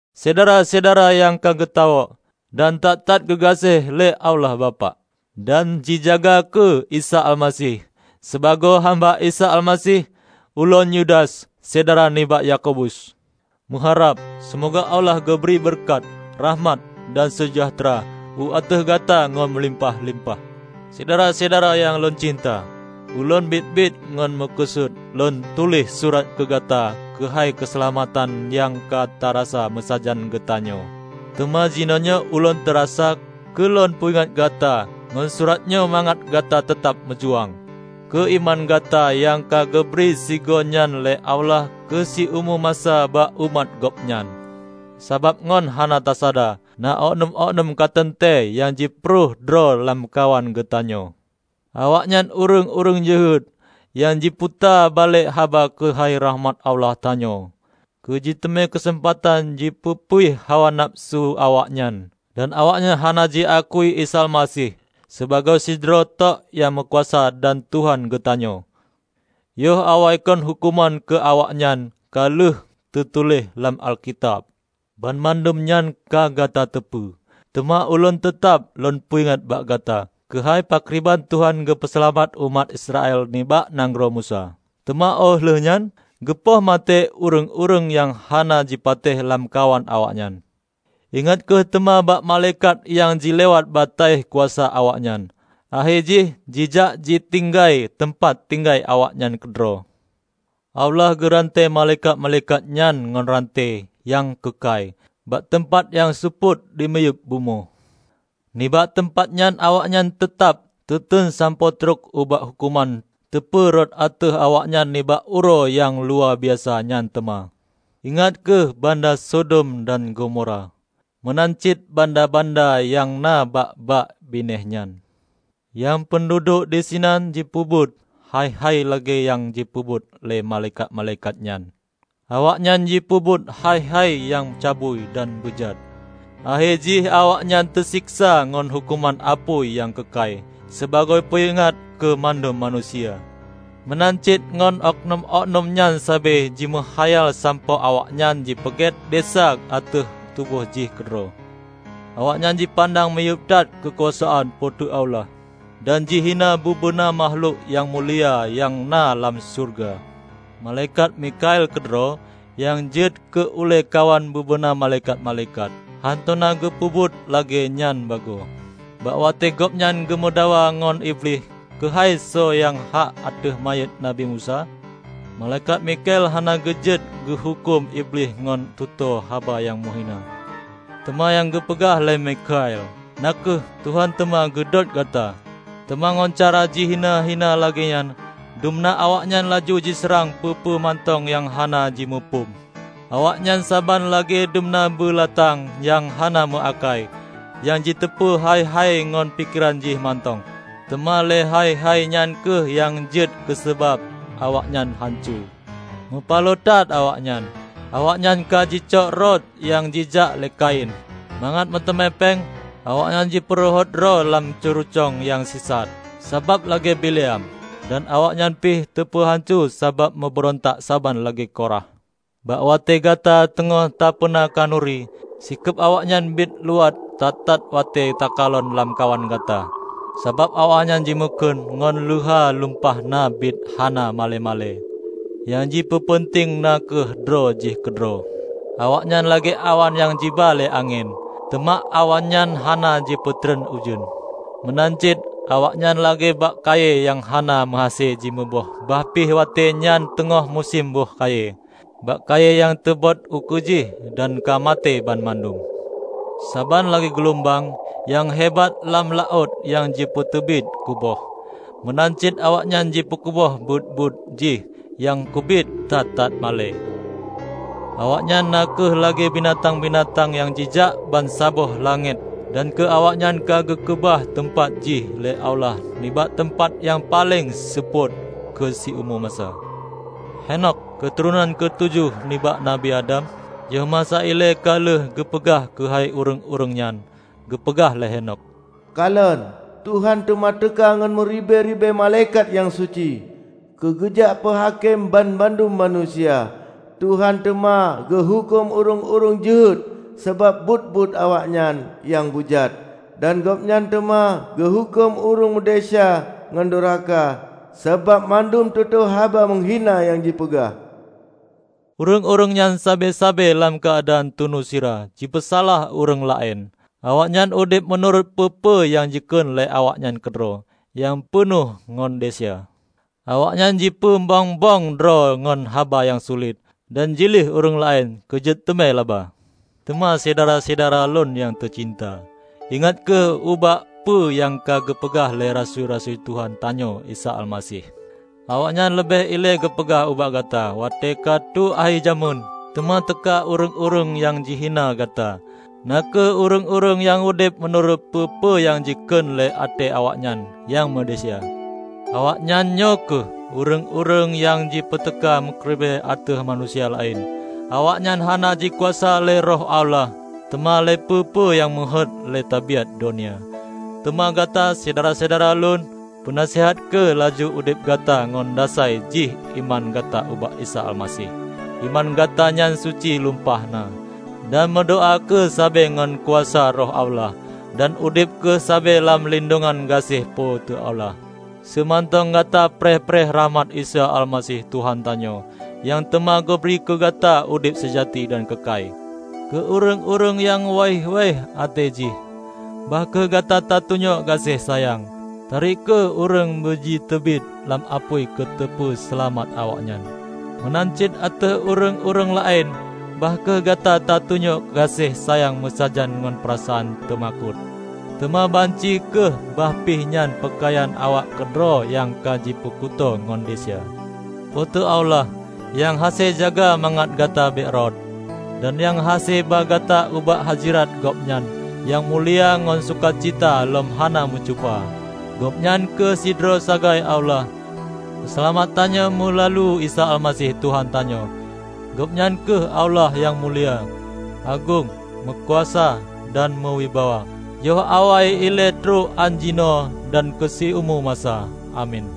Syedara-syedara nyang ka geutawök dan that-that geugaséh lé Allah Bapak, dan jijaga keu Isa Almaseh. Sibagoe hamba Isa Almaseh, ulôn -- Yudas -- syedara nibak Yakobus, meuharab: Seumoga Allah geubri beureukat, rakhmat dan seujahteura u ateueh gata ngon meulimpah-limpah. Syedara-syedara nyang lôn cinta! Ulôn biet-biet ngon meukeusut lôn tuléh surat keu gata keuhai keuseulamatan nyang ka tarasa meusajan geutanyoe. Teuma jinoenyoe ulôn teurasa keu lôn peuingat gata ngon surat nyoe mangat gata teutab meujuang keu iman gata nyang ka geubri sigoe nyan lé Allah keu siumu masa bak umat Gobnyan. Sabab ngon hana tasada, na okeunum-okeunum ka teuntée nyang jipeurhoh droe lamkawan geutanyoe. Awaknyan ureuëng-ureuëng jeuhet nyang jiputa balek haba keuhai rakhmat Allah tanyoe, keujiteumé keuseumpatan jipeupuih hawa nafeusu awaknyan. Dan awaknyan hana jiaku Isa Almaseh, sibagoe sidroe tok nyang meukuasa dan Tuhan geutanyoe. Yoh awaikon huköman keu awaknyan ka lheueh teutuléh lam Alkitab. Banmandum nyan ka gata teupeue. Teuma ulôn teutab lôn peuingat bak gata keuhai pakriban Tuhan geupeuseulamat umat Israel nibak nanggroe Meusé, teuma óh lheueh nyan geupoh maté ureuëng-ureuëng nyang hana jipatéh lamkawan awaknyan. Ingat kheueh teuma bak malaikat nyang jilewat bataih kuasa awaknyan, akhé jih jijak jitinggai teumpat tinggai awaknyan keudroe. Allah geuranté malaikat-malaikat nyan ngon ranté nyang keukai, bak teumpat nyang seupôt dimiyueb bumoe. Nibak teumpat nyan awaknyan teutab teuteun sampoe trok ubak huköman teupeu rhot ateueh awaknyan nibak Uroe nyang luwabiasa nyan teuma. Ingat kheueh banda Sodom dan Gomora meunan cit banda-banda nyang na bak-bak binéh nyan, nyang peunduduek disinan jipeubuet hai-hai lagée nyang jipeubuet lé malaikat-malaikat nyan. Awaknyan jipeubuet hai-hai nyang cabui dan beujat, akhé jih awaknyan teuseksa ngon huköman apui nyang keukai, sibagoe peuingat keu mandum manusia. Meunan cit ngon okeunum-okeunum nyan sabe jimeukhayal sampoe awaknyan jipeugét desya ateueh tuboh jih keudroe. Awaknyan jipandang miyueb that keukuasaan Po teu Allah dan jihina bubena makhlok nyang mulia nyang na lam syeuruga. Malaikat Mikhael keudroe, nyang jeuet keu ulée kawan bubena malaikat-malaikat, hántom na geupeubuet lagée nyan bagoe. Bak watée gobnyan geumeudakwa ngon Iblih keuhai soe nyang hak ateueh manyét Nabi Musa, malaikat Mikhael hana geujeuet geuhuköm Iblih ngon tutoe haba nyang meuhina. Teuma nyang geupeugah lé Mikhael na kheueh, "Tuhan teuma geudôt gata!" Teuma ngon cara jihina-hina lagée nyan, dumna awaknyan laju jiseurang peue-peue mantong nyang hana jimuphom. Awaknyan saban lagée dumna beulatang nyang hana meuakai, nyang jiteupeue hai-hai ngon pikeran jih mantong. Teuma lé hai-hai nyan kheueh nyang jeuet keusabab awaknyan hanco. Mupaloe that awaknyan! Awaknyan ka jicok rot nyang jijak lé Kain. Mangat meuteumé péng, awaknyan jipeurhot droe lam ceurucong nyang sisat, sabab lagée Bileam. Dan awaknyan pih teupeuhanco sabab meubeurontak saban lagée Korah. Bak watée gata teungoh tapeuna khanuri, sikeub awaknyan biet luwat that-that watée takalon lamkawan gata. Sabab awaknyan jimakheun ngon leuha lumpah na biet hana malée-malée, nyang jipeupeunteng na kheueh droe jih keudroe. Awaknyan lagée awan nyang jiba lé angén, teuma awan nyan hana jipeutreun ujeuen. Meunan cit awaknyan lagée bak kayée nyang hana meuhase jimuboh bah pih watée nyan teungoh musém boh kayée; bak kayée nyang teubot ukeue jih dan ka maté banmandum. Saban lagée gulumbang nyang hebat lam laôt nyang jipeuteubiet kuboh, meunan cit awaknyan jipeukuboh buet-buet jih nyang keubiet that-that malée. Awaknyan na kheueh lagée bintang-bintang nyang jijak bansaboh langét dan keu awaknyan ka geukeubah teumpat jih lé Allah nibak teumpat nyang paleng seupôt keu siumu masa. Henokh, keuturonan keu tujoh nibak Nabi Adam, yoh masa ilée ka lheueh geupeugah keuhai ureuëng-ureuëng nyan. Geupeugah lé Henokh, "Kalon, Tuhan teuma teuka ngon meuribée-ribée malaikat nyang suci keugeujak peuhakém banmandum manusia. Tuhan teuma geuhuköm ureuëng-ureuëng jeuhet sabab buet-buet awaknyan nyang beujat. Dan Gobnyan teuma geuhuköm ureuëng meudesya ngon doraka sabab mandum tutoe haba meuhina nyang jipeugah." Ureuëng-ureuëng nyan sabe-sabe lam keuadaan tunu sira jipeusalah ureuëng laén. Awaknyan udeb meunurot peue-peue nyang jikheun lé awaknyan keudroe nyang peunoh ngon desya. Awaknyan jipeu mbong-mbong droe ngon haba nyang sulet, dan jilieh ureuëng laén keujiteumé laba. Teuma Syedara-syedara lôn nyang teucinta, ingat kheueh ubak peue nyang ka geupeugah lé rasui-rasui Tuhan tanyoe Isa Almaseh. Awaknyan leubeh ilée geupeugah ubak gata watée ka tho akhé jamén teuma teuka ureuëng-ureuëng nyang jihina gata, na kheueh ureuëng-ureuëng nyang udeb meunurot peue-peue nyang jikheun lé até awaknyan nyang meudesya. Awaknyan nyoe kheueh ureuëng-ureuëng nyang jipeuteuka mucrebre ateueh manusia laén. Awaknyan hana jikuasa lé Roh Allah, teuma lé peue-peue nyang meuheuét lé tabiát donya. Teuma gata, Syedara-syedara lôn, peusaneut kheueh laju udeb gata ngon dasai jih iman gata ubak Isa Almaseh. Iman gata nyan suci lumpah na. Dan meudoá kheueh sabe ngon kuasa Roh Allah, dan udeb kheueh sabe lam lindongan gaséh Po teu Allah seumantong gata preh-preh rakhmat Isa Almaseh Tuhan tanyoe, nyang teuma geubri keu gata udeb seujati dan keukai. Keu ureuëng-ureuëng nyang waih-waih até jih, bah kheueh gata tatunyok gaséh sayang. Tarek kheueh ureuëng beujiteubiet lam apui keuteupeu seulamat awaknyan. Meunan cit ateueh ureuëng-ureuëng laén bah kheueh gata tatunyok gaséh sayang meusajan ngon peurasaan teumakot, teuma banci kheueh bah pih nyan peukayan awaknyan keudroe nyang ka jipeukuto ngon desya. Po teu Allah, nyang hase jaga mangat gata bék rhot, dan nyang hase ba gata ubak hazirat Gobnyan nyang mulia ngon sukacita lom hana meucupa, Gobnyan kheueh sidroe sagai Allah, Peuseulamat tanyoe meulalu Isa Almaseh Tuhan tanyoe. Gobnyan kheueh Allah nyang mulia, agong, meukuasa dan meuwibawa yoh awai ilée trok án jinoe dan keu siumu masa! Amin.